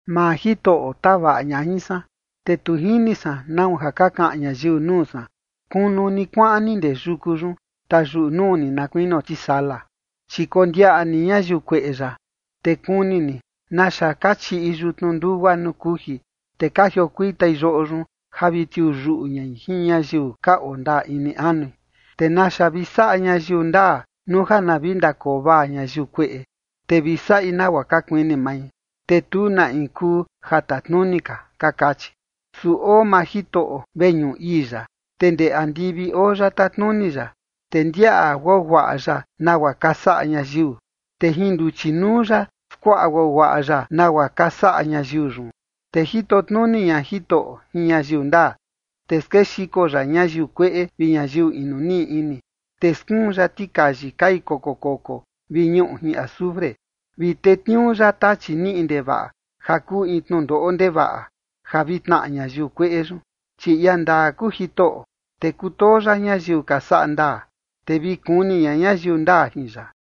Maa Jitoꞌo tavaꞌa ña jin san, te tu jini san nau ja ka kaꞌan ñayiu nuu san: “Kunu ni kuaꞌan ni ndee yuku yun, tayuꞌu nuu ni na kuinio tisala”. Chi kondiaꞌa ni ñayiu kueꞌe yaꞌa, te kuni ni naxa ka chiꞌi yutnu ndugua nuu kuji, te ka jiokuitai yoꞌo yun ja vi tiuu yuꞌu ñai jin ñayiu ka oo ndaa ini anui. ¿Te naxa vi saꞌa ñayiu ndaa nuu ja na vi ndakoo vaa ñayiu kueꞌe, te vi saꞌi nagua ka kuini mai, te tu na in kuu ja tatnuni ka?, ka kachi. Su oo maa Jitoꞌo veñuꞌu ii ya, te ndee andivi oo ya tatnuni ya, te ndiaꞌa guaguaꞌa ya nagua ka saꞌa ñayiu, te jin nduchi nuu ya skuaꞌa guaguaꞌa ya nagua ka saꞌa ñayiu yun. Te jito tnuni ña Jitoꞌo jin ñayiu ndaa, te skexiko ya ñayiu kueꞌe vi ñayiu inu niꞌi ini. Te skuun ya tikayi kai koko koko vi ñuꞌu jin azufre, vi tetniuu ya tachi niꞌi ndevaꞌa ja kuu in tnundoꞌo ndevaꞌa ja vi tnaꞌa ñayiu kueꞌe yun. Chi ia ndaa kuu Jitoꞌo, te kutoo ya ñayiu ka saꞌa ndaa, te vi kuni ña ñayiu ndaa jin ya.